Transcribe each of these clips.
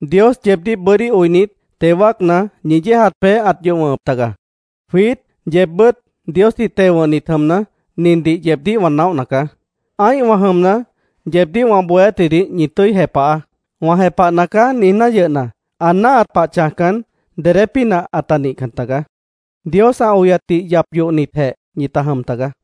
Dios yeebdíh bʉ́dí oinit, teo wáacna, ñi yéejat peéh ãt yoh wʉ̃hʉp taga. Jwiít, yeebbʉ́t Diosdih teo wʉ̃hnit jʉmna, nindih yeebdíh wã naóhna caá: Ã́ihwã jʉmna, yeebdíh wã bohéátjidih ñi tʉ́i jepahaá. “Wã jepahna caá”, niijná yʉhna, ã náahat pah chãjcan, dedé pínah ãta nihcan tagaá. Dios ã oyatdih yap yohnitjeh ñita jʉm tagaá.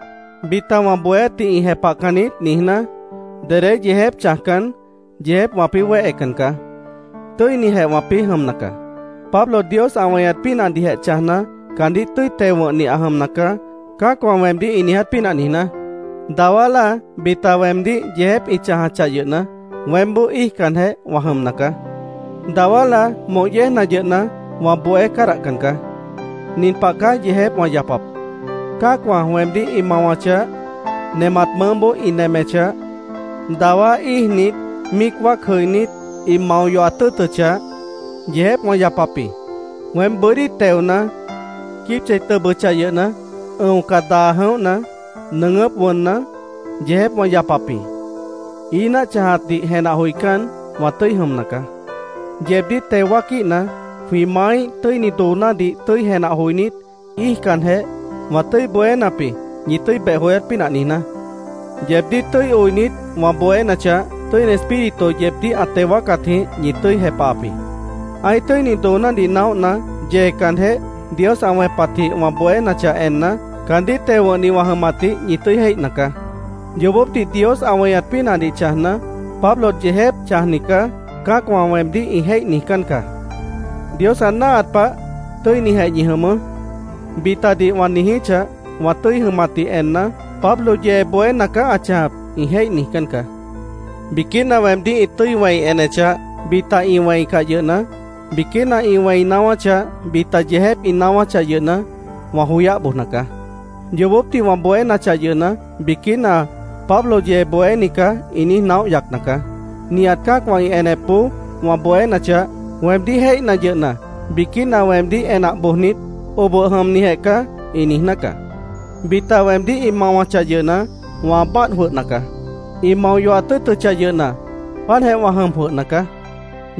“Bita wã bohéátdih ĩ jepahcan niít”, niijná, dedé yeejép chãjcan, yeejép wãpĩ́ wéhecan caá. Tʉ́inijeh wãpĩ́ jʉmna caá, “Pablo Dios ã weñat pínahdihjeh chãjna, caandíh tʉ́i teo wʉ̃hni ã jʉmna caá”, cã́acwã weemdíh ĩ niiját pínah niijná. Dawá láa bita weemdíh yeejép ĩ chãjachah yʉhna, weémboó íijcanjeh wã jʉmna caá. Dawá láa moh yéejna yʉhna, wã bohé cádahcan caá. Nin pah caá yeejép wã yapap: Cã́acwã weemdíh ĩ mawachah; nemat mʉʉ́boó ĩ nemechah; dawá íijnit, míic wáac jʉinít, ĩ mao yohat tʉ́ʉtʉchah, yeejép wã yapap jĩ. Weém bʉ́dí teona; quíib chei tʉbʉchah yʉhna, ʉ̃oca daa jʉ̃óhna; nʉʉgʉ́p wʉnna, yeejép wã yapap jĩ. Ií náah chãjatdih jenah joicán, wã tʉ́i jʉmna caá. Yeebdíh teo wáaquíhna, jwĩ maáíh tʉ́ini doonádih tʉ́i jenah joinít, íijcanjeh, wã tʉ́i bohénap jĩ, ñi tʉ́i beh joyát pínah niijná. Yeebdíh tʉ́i oinit, wã bohénachah, Tʉ́ini Espíritu yeebdíh ã teo wáacatjĩh ñi tʉ́i jepahap jĩ. Ã́ih tʉ́ini doonádih naóhna, yeecanjeh, Dios ã wẽpatjĩh wã bohénachah enna, caandíh teo wʉ̃hni wã jʉmatdih ñi tʉ́i jéihna caá. Yoobópdih Dios ã weñat pínahdih chãjna, “Pablo yeejép chãjni caá”, cã́acwã weemdíh ĩ jéih niijcán caá. “Dios ã náahat pah, tʉ́inijeh ñi jʉmʉʉ́”, bitadih wã niijíchah, wã tʉ́i jʉmatdih enna, “Pablo yee bohéna caá ã chãjap”, ĩ jéih niijcán caá. Biquína weemdíh ĩ tʉ́i wẽi enechah, bita ĩ wẽi encah yʉhna, biquína ĩ wẽi naáwáchah, bita yeejép ĩ naáwáchah yʉhna, wã joyáh bojna caá. Yoobópdih wã bohénachah yʉhna, biquína “Pablo yee bohéni caá”, ĩ niíj naóh yacna caá. Nihat cã́acwã ĩ enepboó wã bohénachah, weemdíh jéihna yʉhna, biquína weemdíh enah bojnit, “Oboh jʉmnijeh caá”, ĩ niijná caá. Bita weemdíh ĩ mawachah yʉhna, wã báadh jwʉhna caá. Ĩ mao yohat tʉ́ʉtʉchah yʉhna, páantjeh wã jʉm jwʉhna caá.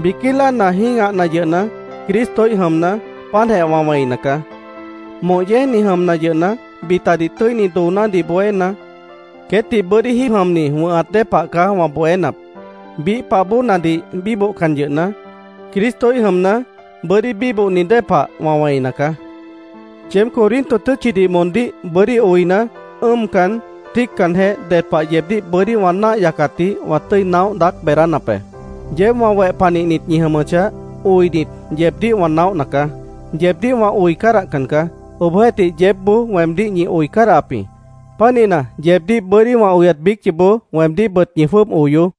Biquí láana jĩ́gahna yʉhna, Cristoíh jʉmna, páantjeh wã wẽina caá. Moh yéejni jʉmna yʉhna, bitadih tʉ́ini doonádih bohéna, queétdih bʉ́dí jíib jʉmni wʉ̃hat dée pah caá wã bohénap. Biíh pah bóonadih bíbohcan yʉhna, Cristoíh jʉmna, bʉ́dí bíbohni dée pah wã wẽina caá. Yeéb Corinto tʉ́tchidih moondíh bʉ́dí oina, ʉ́ʉmcan, tíiccanjeh, ded pah yeebdíh bʉ́dí wã náah yacatdih wã tʉ́i naóh daác beedánap be. Yeéb wã weh panihnit ñi jʉmʉchah, oinit, yeebdíh wã naóhna caá. Yeebdíh wã oi cádahcan caá. Obohjeéhtih, yeébboó weemdíh ñi oi cádahap jĩ. Pánihna, yeebdíh bʉ́dí wã oyat biíc yoobó weemdíhbʉt ñi jwʉ́ʉb oyoó.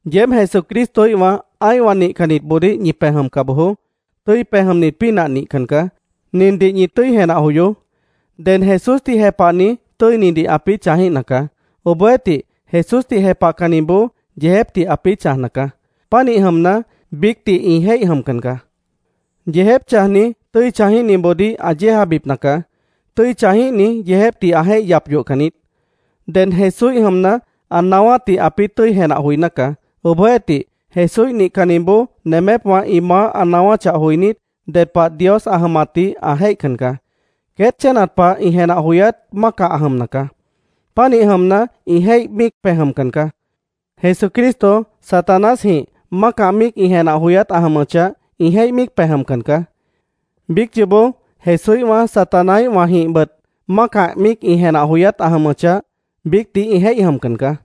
Yeéb Jesucristoíhwã ã́ihwã nihcannitboodíh ñi pej jʉmca bojoó. Tʉ́i pej jʉmnit pínah nihcan caá. Nindih ñi tʉ́i jenah joyoó: Ded Jesúsdih jepahni, tʉ́inidih ãpĩ́ chãjíhna caá. Obohjeéhtih, Jesúsdih jepahcanniboó, yeejépdih ãpĩ́ chãjna caá. Pánih jʉmna, biícdih ĩ jéih jʉmcan caá. Yeejép chãjni tʉ́i chãjíhniboodíh ã yéejabipna caá. Tʉ́i chãjíhni yeejépdih ã jéih yap yohcan niít. Ded Jesúíh jʉmna, ã naáwátdih ãpĩ́ tʉ́i jenah joiná caá. Obohjeéhtih, Jesúíh nihcanniboó nemépwã ĩ maáh ã naáwáchah joinít, ded pah Dios ã jʉmatdih ã jéihcan caá. Queét chénat pah ĩ jenah joyát mácah ã jʉmna caá. Pánih jʉmna, ĩ jéih míic pej jʉmcan caá. Jesucristo Satanásjĩh mácah míic ĩ jenah joyát ã jʉmʉchah, ĩ jéih míic pej jʉmcan caá. Biíc yoobó Jesúíhwã Satanáíhwãjĩhbʉt mácah míic ĩ jenah joyát ã jʉmʉchah, biícdih ĩ jéih jʉmcan caá.